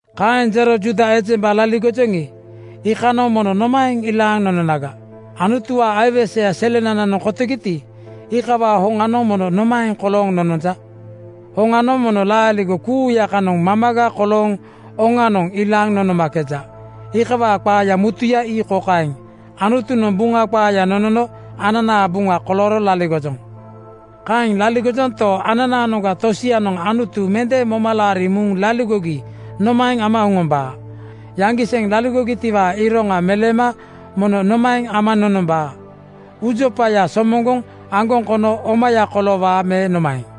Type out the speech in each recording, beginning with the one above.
Kaeŋ ero Juuda ejemba laligojoŋi, iikanoŋ mono nomaeŋ ilaaŋ nononaga? Anutuwaa aiweseya selenananoŋ kotogiti, iikawaa hoŋanoŋ mono nomaeŋ kolooŋ nononja? Hoŋanoŋ mono laaligo kuuya kanoŋ mamaga kolooŋ oŋanoŋ ilaaŋ nonomakeja. Iikawaa qaaya mutuya ii kokaeŋ: Anutunoŋ Buŋa qaaya nonono ananaa buŋa kolooro laligojoŋ. Kaeŋ laligojonto, ananaanoŋga tosianoŋ Anutu mende moma laariŋ muŋ laligogi nomaeŋ ama oŋombaa? Yaŋgiseŋ laligogitiwaa iroŋa meleema mono nomaeŋ ama nonombaa? Uujopaya somoŋgoŋ aŋgoŋ kono omaya koloowaa me nomaeŋ?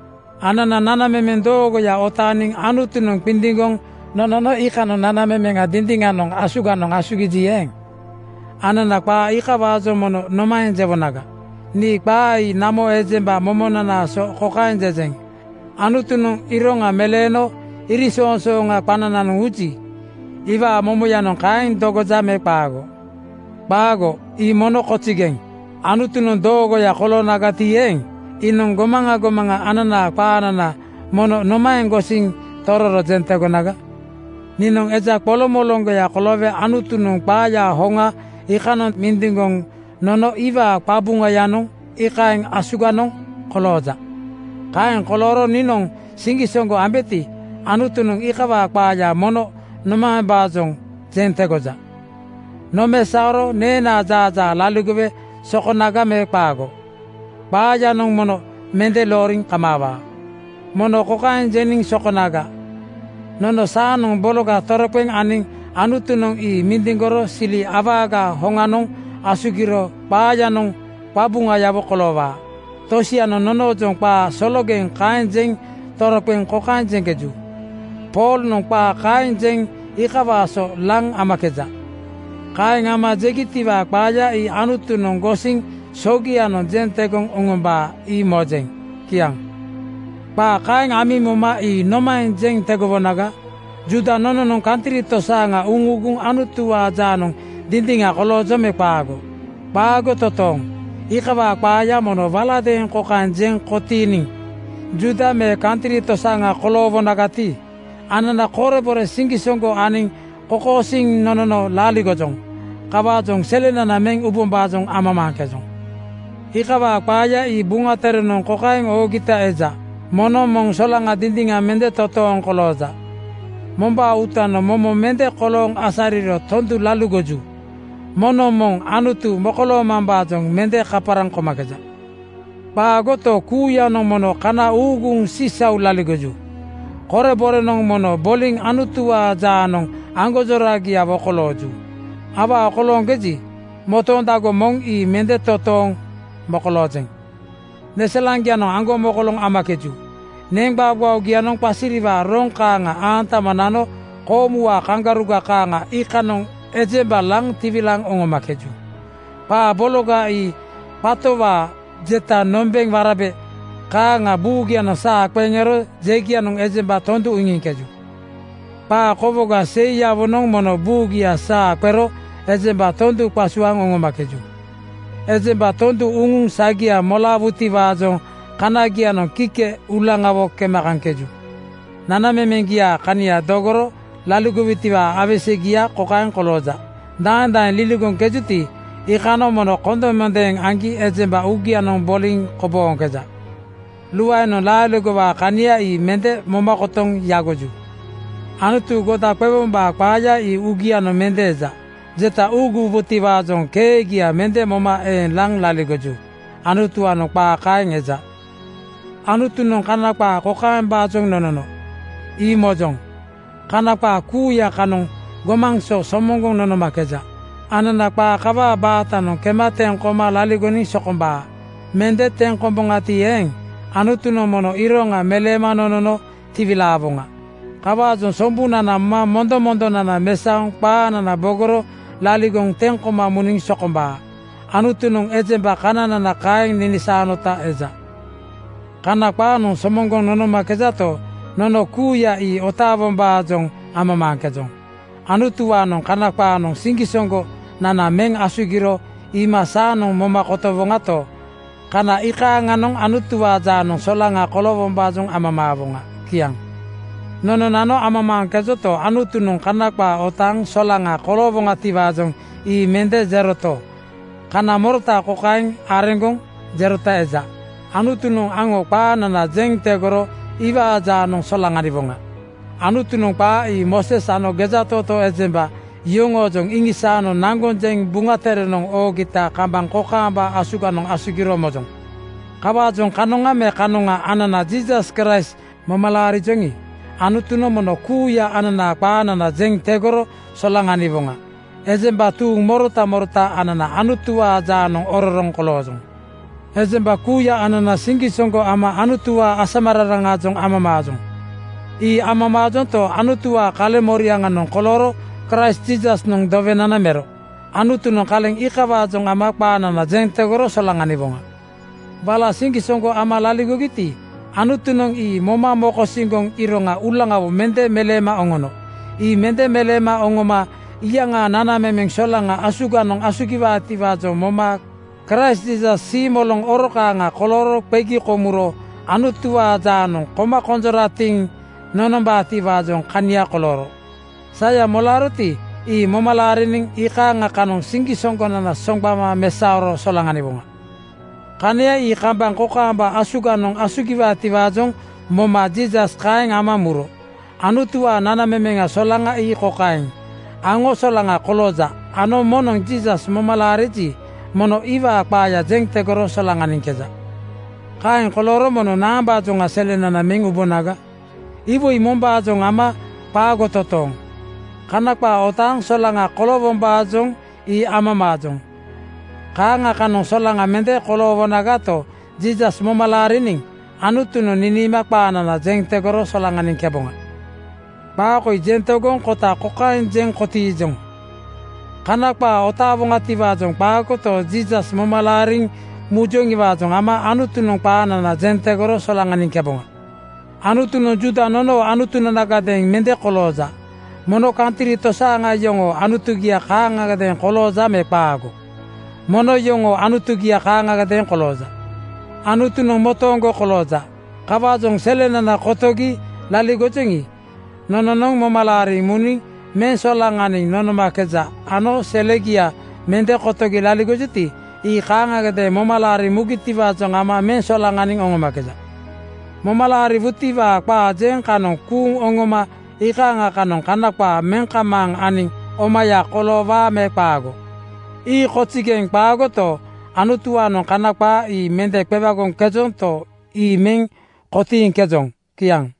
Anana nanamemeŋ doogoya otaaniŋ Anutunoŋ qindiŋgoŋ nonono iikanoŋ nanamemeŋa dindiŋanoŋ asuganoŋ asugiji eeŋ, anana qaa iikawaajoŋ mono nomaeŋ jewonaga? Nii qaa ii namo ejemba momonanaa so kokaeŋ jejeŋ: Anutunoŋ iroŋa meleeno iriŋsoŋsooŋanoŋ qanananoŋ uji, iwaa momoyanoŋ kaeŋ dogoja me qaago? Qaago, ii mono kozigeŋ! Anutunoŋ doogoya koloonagati eeŋ, iinoŋ gomaŋa gomaŋa ananaa qaanana mono nomaeŋ gosiŋ tororo jeŋ tegonaga? Niinoŋ eja qoloŋmoloŋgoya koloowe Anutunoŋ qaaya hoŋa iikanoŋ mindiŋgoŋ nono iwaa qabuŋayanoŋ iikaeŋ asuganoŋ kolooja. Kaeŋ kolooro niinoŋ siŋgisoŋgo ambeti, Anutunoŋ iikawaa qaaya mono nomaembaajoŋ jeŋ tegoja? Nomesaoro neenaa jaajaa laligowe sokonaga me qaago? Qaayanoŋ mono mende looriŋ kamaawaa. Mono kokaeŋ jeniŋ sokonaga, “Nono saanoŋ bologa toroqeŋ aniŋ Anutunoŋ ii mindiŋgoro sili awagaa hoŋanoŋ asugiro qaayanoŋ qabuŋayawo koloowaa.” Tosianoŋ nonoojoŋ qaa sologeŋ kaeŋ jeŋ toroqeŋ kokaeŋ jeŋkeju, “Poolnoŋ qaa kaeŋ jeŋ iikawaa so laŋ amakeja.” Kaeŋ ama jegitiwaa qaaya ii Anutunoŋ gosiŋ sogianoŋ jeŋ tegoŋ oŋombaa, ii mojeŋ. Kiaŋ. Qaa kaeŋ amiŋ moma ii nomaeŋ jeŋ tegowonaga? Juuda nononoŋ kantri tosaaŋa uŋuuguŋ Anutuwaa jaanoŋ dindiŋa koloojoŋ me qaago? Qaago totooŋ! Iikawaa qaaya mono waladeeŋ kokaeŋ jeŋ kotiiniŋ: Juuda me kantri tosaaŋa koloowonagati, anana korebore siŋgisoŋgo aniŋ kokosiiŋ nonono laligojoŋ. Kawaajoŋ selenana meŋ ubombaajoŋ amamaaŋkejoŋ. Iikawaa qaaya ii Buŋa Terenoŋ kokaeŋ oogita eja, “Moŋnoŋ moŋ solaŋa dindiŋa mende totooŋ kolooja. Mombaa uutanoŋ momo mende kolooŋ asariro tondu laligoju. Moŋnoŋ moŋ Anutu mokoloomambaajoŋ mende kaparaŋ komakeja. Qaagoto, kuuyanoŋ mono kana uuguŋ sisau laligoju. Koreborenoŋ mono boliŋ Anutuwaa jaanoŋ aŋgonjoragiawo kolooju. Awaa kolooŋkeji, motoondago moŋ ii mende totooŋ mokoloojeŋ. Neselaŋgianoŋ aŋgomokoloŋ amakeju. Neŋgbaogbaogianoŋ qasiriwaa roŋ kaaŋa aantama nano koomuwaa kaŋgaruga kaaŋa iikanoŋ ejemba laŋ tiwilaaŋ oŋomakeju. Qaa bologa ii qatowaa jeta nombeŋ warabe kaaŋa buugianoŋ saa qeŋ ero jegianoŋ ejemba tondu iŋiŋkeju. Qaa kowoga seiyawonoŋ mono buugia saa qero ejemba tondu qasuaaŋ oŋomakeju. Ejemba tondu uŋuŋ sagia molaawutiwaajoŋ kanagianoŋ kike uulaŋawo kema kaŋkeju. Nanamemeŋgiaa kania dogoro laligojutiwaa aiwesegia kokaeŋ kolooja: Daeŋ daeŋ liligoŋkejuti, iikanoŋ mono kondemondeeŋ aŋgi ejemba uugianoŋ boliŋ kobooŋkeja. Luaenoŋ laaligowaa kania ii mende moma kotoŋ yagoju. Anutu goda qewombaa qaaya ii uugianoŋ mende eja. Jeta uuguwubotiwaajoŋ keegia mende moma eeŋ laŋ laligoju.” Anutuwaanoŋ qaa kaeŋ eja. Anutunoŋ Kana qaa kokaembaajoŋ nonono, ii mojoŋ: Kana qaa kuuya kanoŋ gomaŋ so somoŋgoŋ nonomakeja. Anana qaa kawaa baatanoŋ kema teŋ koma laligoniŋ sokombaa. Mende teŋ komboŋati eeŋ, Anutunoŋ mono iroŋa meleema nonono tiwilaawoŋa. Kawaajoŋ sombunana moma mondomondonana mesaoŋ qaanana bogoro laligoŋ teŋ koma muniŋ sokombaa. Anutunoŋ ejemba kananana kaeŋ ninisaanota eja. Kana qaanoŋ somoŋgoŋ nonomakejato, nono kuuya ii otaa-wombaajoŋ amamaaŋkejoŋ. Anutuwaanoŋ Kana qaanoŋ siŋgisoŋgo-nana meŋ asugiro iima saanoŋ moma kotowoŋato, kana iikanoŋ Anutuwaa jaanoŋ solaŋa koloowombaajoŋ amamaawoŋa. Kiaŋ. Nononano amamaaŋkejonto, Anutunoŋ Kana qaa otaaŋ solaŋa koloowoŋatiwaajoŋ ii mende jeroto, kana morota kokaeŋ areŋgoŋ jerota eja: Anutunoŋ aŋo qaanana jeŋ tegoro iwaa jaanoŋ solaŋaniwoŋa. Anutunoŋ qaa ii Mooses ano gejatootoo ejemba yoŋoojoŋ iŋisaano naŋgoŋ jeŋ Buŋa Terenoŋ oogita kambaŋ kokaamba asuganoŋ asugiro mojoŋ. Kawaajoŋ kanoŋa me kanoŋa anana Jiisas Kraist moma laarijoŋi, Anutunoŋ mono kuuya ananaa qaanana jeŋ tegoro solaŋaniwoŋa. Ejemba tuuŋ morota morota anana Anutuwaa jaanoŋ ororoŋ koloojoŋ. Ejemba kuuya anana siŋgisoŋgo ama Anutuwaa asamararaŋaajoŋ amamaajoŋ. Ii amamaajonto, Anutuwaa kaleŋmoriaŋanoŋ kolooro Kraist Jiisasnoŋ dowenana mero. Anutunoŋ kaleŋ iikawaajoŋ ama qaanana jeŋ tegoro solaŋaniwoŋa. Wala siŋgisoŋgo ama laligogiti, Anutunoŋ ii moma mokosiŋgoŋ iroŋa uulaŋawo mende meleema oŋono. Ii mende meleema oŋoma iyaŋaa nanamemeŋ solaŋanoŋ asuganoŋ asugiwaatiwaajoŋ moma Kraist Jiisas siimoloŋ oro kaaŋa kolooro qegi komuro Anutuwaa jaanoŋ koma konjoratiŋ nonombaatiwaa kania kolooro. Saya molaaroti, ii moma laariniŋ iikaaŋa kanoŋ siŋgisoŋgonana soŋgbama mesaoro solaŋaniwoŋa. Kania ii kambaŋ kokaamba asuganoŋ asugiwaatiwaajoŋ moma Jiisas kaeŋ ama muro. Anutuwaa nanamemeŋ solaŋa ii kokaeŋ: Aŋo solaŋa kolooja ano moŋnoŋ Jiisas moma laariji, mono iwaa qaaya jeŋ tegoro solaŋaniŋkeja. Kaeŋ kolooro mono naambaajoŋa selenana meŋ ubonaga? Iwoi mombaajoŋa ama qaago totooŋ. Kana qaa otaaŋ solaŋa koloowombaajoŋ ii amamaajoŋ. Kaaŋa kanoŋ solaŋa mende koloowoŋato, Jiisas moma laariniŋ Anutunoŋ niniima qaanana jeŋ tegoro solaŋaniŋkeboŋa. Qaa koi jeŋ tegoŋ kota kokaeŋ jeŋ kotiijoŋ: Kana qaa otaaŋkejoŋiwaajoŋ qaagoto, Jiisas moma laariŋ mujoŋiwaajoŋ ama Anutunoŋ qaanana jeŋ tegoro solaŋaniŋkeboŋa. Anutunoŋ Juuda nonoo Anutunanagadeeŋ mende kolooja. Mono kantri tosaaŋa yoŋoo Anutugia kaaŋagadeeŋ kolooja me qaago? Mono yoŋoo Anutugia kaaŋgadeeŋ kolooja. Anutunoŋ motooŋgo kolooja. Kawaajoŋ selenana kotogi laligojoŋi, nononoŋ moma laariŋ muniŋ meŋ solaŋaniŋ nonomakeja ano selegia mende kotogi laligojuti, ii kaaŋagadeeŋ moma laariŋ mugitiwaajoŋ ama meŋ solaŋaniŋ oŋomakeja. Moma laariwutiwaa qaa jeŋ kanoŋ kuuŋ oŋoma iikaaŋa kanoŋ Kana qaa meŋ kamaaŋ aniŋ omaya koloowaa me qaago? Ii kozigeŋ qaagoto, Anutuwaanoŋ Kana qaa ii mende qewagoŋkejonto, ii meŋ kotiiŋkejoŋ. Kiaŋ.